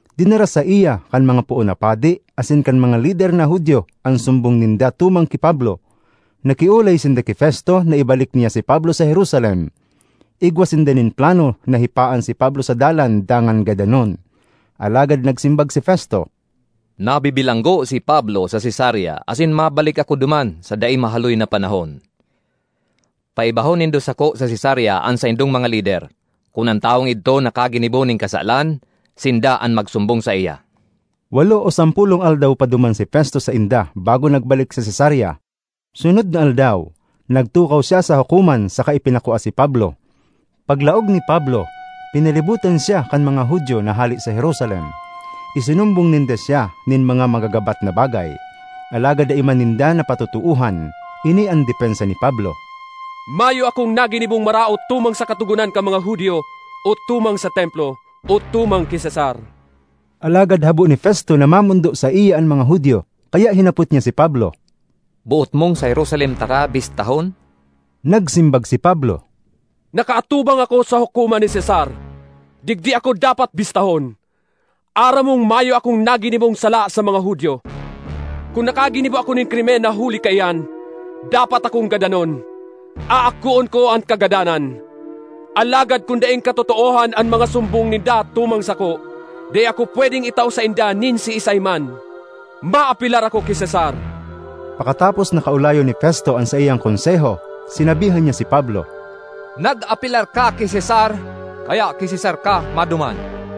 Dinara saiya kan mga poon na padi asin kan mga lider na Judio an sumbong ninda tumang ki Pablo. Nakiolay sinda ki Festo na ibalik niya si Pablo sa Jerusalem. Igwa sinda nin plano na hipaan si Pablo sa dalan dangan gadanon. Alagad nagsimbag si Festo, “Nabibilanggo si Pablo sa Cesarea asin mabalik ako duman sa dai mahaloy na panahon. Paibahon nindo sako sa Cesarea an saindong mga lider; kun an tawong idto nakaginibo nin kasalan, sinda an magsumbong saiya.” Walo o sampolong aldaw pa duman si Festo sainda bago nagbalik sa Cesarea. Sunod na aldaw, nagtukaw siya sa hukoman saka ipinakua si Pablo. Paglaog ni Pablo, pinalibotan siya kan mga Judio na hale sa Jerusalem; isinumbong ninda siya nin mga magagabat na bagay, alagad dai man ninda napatotoohan. Ini an depensa ni Pablo, “Mayo akong naginibong maraot tumang sa Katogonan kan mga Judio o tumang sa Templo, o tumang ki Cesar.” Alagad habo ni Festo na mamondo saiya an mga Judio, kaya hinapot niya si Pablo, “Boot mong sa Jerusalem taka bistahon?” Nagsimbag si Pablo, “Nakaatubang ako sa hukoman ni Cesar. Digdi ako dapat bistahon. Aram mong mayo akong naginibong sala sa mga Judio. Kun nakaginibo ako nin krimen na huli kaiyan dapat akong gadanon, aakoon ko an kagadanan. Alagad kun daing katotoohan an mga sumbong ninda tumang sako, dai ako pwedeng itao sainda nin siisay man. Maapelar ako ki Cesar.” Pakatapos na kaolayon ni Festo an saiyang konseho, sinabihan niya si Pablo, “Nag-apelar ka ki Cesar, kaya ki Cesar ka maduman.”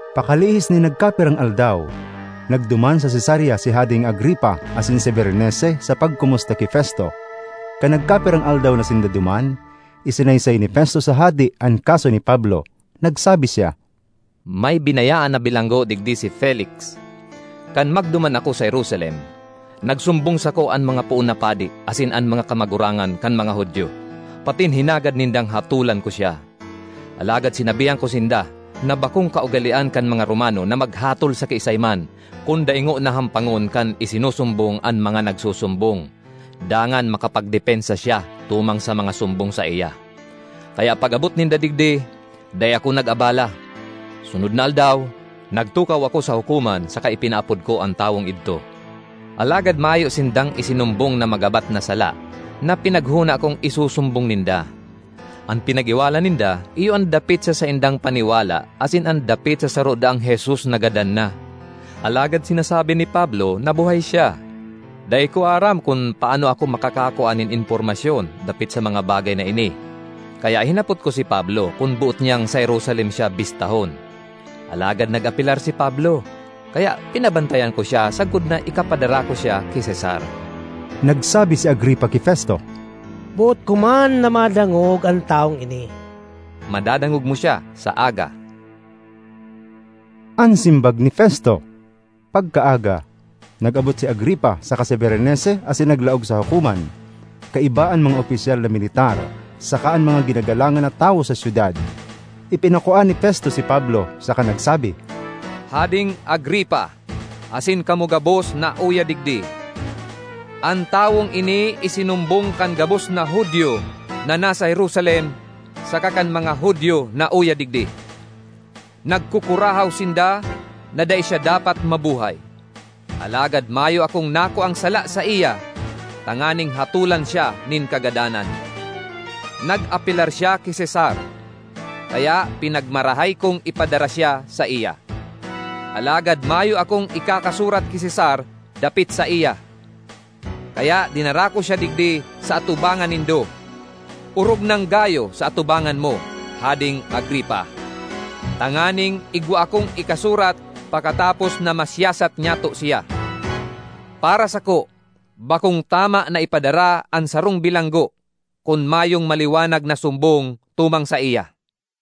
Pakalihis nin nagkapirang aldaw, nagduman sa Cesarea si Hadeng Agripa asin si Berenice sa pagkomusta ki Festo. Kan nagkapirang aldaw na sinda duman, isinaysay ni Festo sa hade an kaso ni Pablo. Nagsabi siya, “May binayaan na bilanggo digdi si Felix. Kan magduman ako sa Jerusalem, nagsumbong sako an mga poon na padi asin an mga kamagurangan kan mga Judio patin hinagad nindang hatolan ko siya. Alagad sinabihan ko sinda na bakong kaugalean kan mga Romano na maghatol sa kiisay man kun dai ngona hampangon kan isinusumbong an mga nagsusumbong, dangan makapagdepensa siya tumang sa mga sumbong saiya. Kaya pag-abot ninda digdi, dai ako nag-abala; sunod na aldaw nagtukaw ako sa hukoman saka ipinaapod ko an tawong idto. Alagad mayo sindang isinumbong na magabat na sala na pinaghona kong isusumbong ninda. An pinag-iwalan ninda iyo an dapit sa saindang paniwala asin an dapit sa saro daang Jesus na gadan na, alagad sinasabi ni Pablo na buhay siya. Dai ko aram kun paano ako makakakua nin impormasyon dapit sa mga bagay na ini, kaya hinapot ko si Pablo kun boot niyang sa Jerusalem siya bistahon. Alagad nag-apelar si Pablo, kaya pinabantayan ko siya sagkod na ikapadara ko siya ki Cesar.” Nagsabi si Agripa ki Festo, “Boot ko man na madangog an tawong ini.” “Madadangog mo siya sa aga,” an simbag ni Festo. Pagkaaga, nag-abot si Agripa saka si Berenice asin naglaog sa hukoman, kaiba an mga opisyal na militar saka an mga ginagalangan na tawo sa syudad. Ipinakua ni Festo si Pablo, saka nagsabi, “Hadeng Agripa asin kamo gabos na uya digdi: an tawong ini isinumbong kan gabos na Judio na nasa Jerusalem saka kan mga Judio na uya digdi. Nagkukurahaw sinda na dai siya dapat mabuhay, alagad mayo akong nakuang sala saiya tanganing hatolan siya nin kagadanan. Nag-apelar siya ki Cesar, kaya pinagmarahay kong ipadara siya saiya. Alagad mayo akong ikakasurat ki Cesar dapit saiya, kaya dinara ko siya digdi sa atubangan nindo, orog nang gayo sa atubangan mo, Hadeng Agripa, tanganing igwa akong ikasurat pakatapos na masiyasat nyato siya. Para sako, bakong tama na ipadara an sarong bilanggo kun mayong maliwanag na sumbong tumang saiya.”